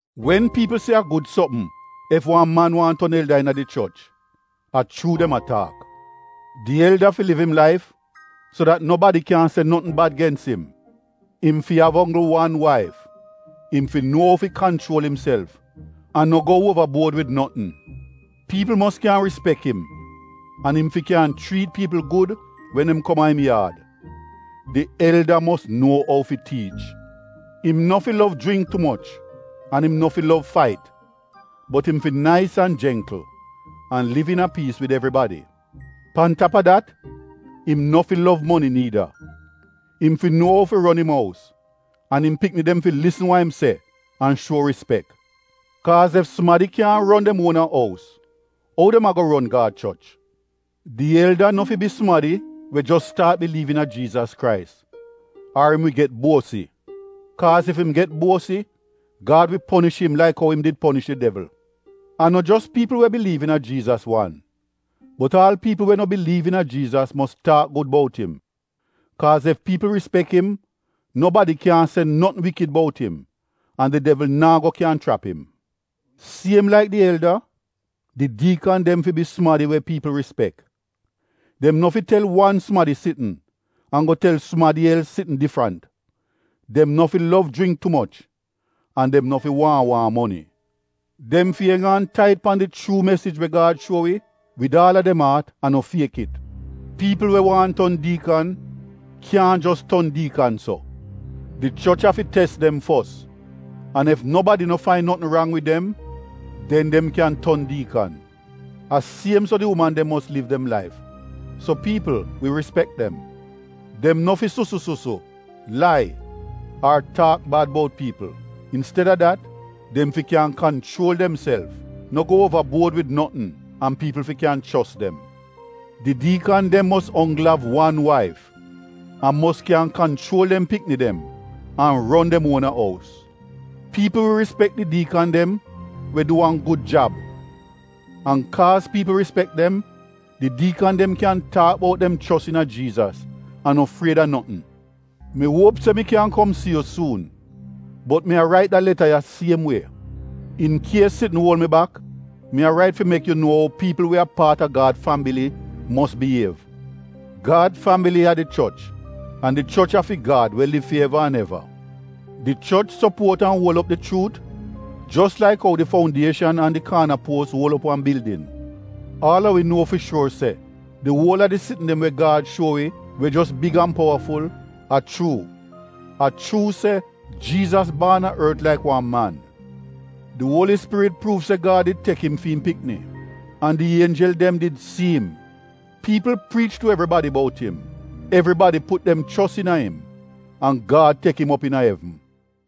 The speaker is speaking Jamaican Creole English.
Wen piipl se a gud sopm ef wan man waahn ton elda iina di choch, a chuu dem a taak. Di elda fi liv im laif so dat nobadi kyaahn se notn bad gens im. Im fi av onggl wan waif, im fi nuo ou fi kanchuol imself an no go uova buod wid notn. Piipl mos kyan rispek im an im fi kyan chriit piipl gud wen dem kom a im yaad. Di elda mos nuo ou fi tiich. Im no fi lov jringk tu moch an im no fi lov fait, bot im fi nais an jengkl an liv iina piis wid evribadi. Pan tap a dat im no fi lov moni niida. Im fi nuo ou fi ron im ous an im pikni dem fi lisn wa im se an shuo rispek. Kaaz ef sumadi kyaahn ron dem uona ous ou dem ago ron Gad choch? Di elda no fi bi sumadi we jos staat biliiv iina Jiizas Krais ar im wi get buosi. Kaaz ef im get buosi Gad wi ponish im laik ou im di ponish di devl. A no jos piipl we biliiv iina Jiizas wan bot aal piipl we no biliiv iina Jiizas mos taak gud bout im. Kaaz ef piipl rispek im nobadi kyaahn se notn wikid bout im an di devl naa go kyan chrap im. Siem laik di elda, di diikan dem fi bi sumadi we piipl rispek. Dem no fi tel wan sumadi sitn an go tel sumadi els sitn difrant, dem no fi lov jringk tu moch an dem no fi waahn waahn moni. Dem fi eng aan tait pan di chuu mesij we Gad shuo wi wid aal a dem aat an no fiek it. Piipl we waahn ton diikan kyaahn jos ton diikan so. Di choch afi tes dem fos, an ef nobadi no fain notn rang wid dem, den dem kyan ton diikan. A siem so di uman dem mos liv dem laif so piipl wi rispek dem. Dem no fi susu-susu, lai ar taak bad bout piipl. Insteda dat dem fi kyan kanchuol demself, no go uova buod wid notn an piipl fi kyan chos dem. Di diikan dem mos onggl av wan waif an mos kyan kanchuol dem pikni dem an ron dem uona ous. Piipl wi rispek di diikan dem we du wan gud jab, an kaaz piipl rispek dem, di diikan dem kyan taak bout dem chos iina Jiizas an no fried a notn. Mi uop se mi kyan kom si yu suun bot mi a rait de leta ya siem wie. In kies sitn uol mi bak mi a rait fi mek yu nuo ou piipl we a paat a Gad fambili mos biyiev. Gad fambili a di choch an di choch a fi Gad we liv fi eva an eva. Di choch sopuot an uol op di chuut jos laik ou di foundieshan an di kaana puos uol op wan bildin. Aal a wi nuo fi shuor se di uol a di sitn dem we Gad shuo wi, we jos griet, a chuu. A chuu se: Jiizas baan a ort laik wan man Di Uoli Spirit pruuv se Gad did tek im fi im Pikni an di ienjel dem did si im. Piipl priich tu evribadi bout im, evribadi put dem chos iina im an Gad tek im op iina evn.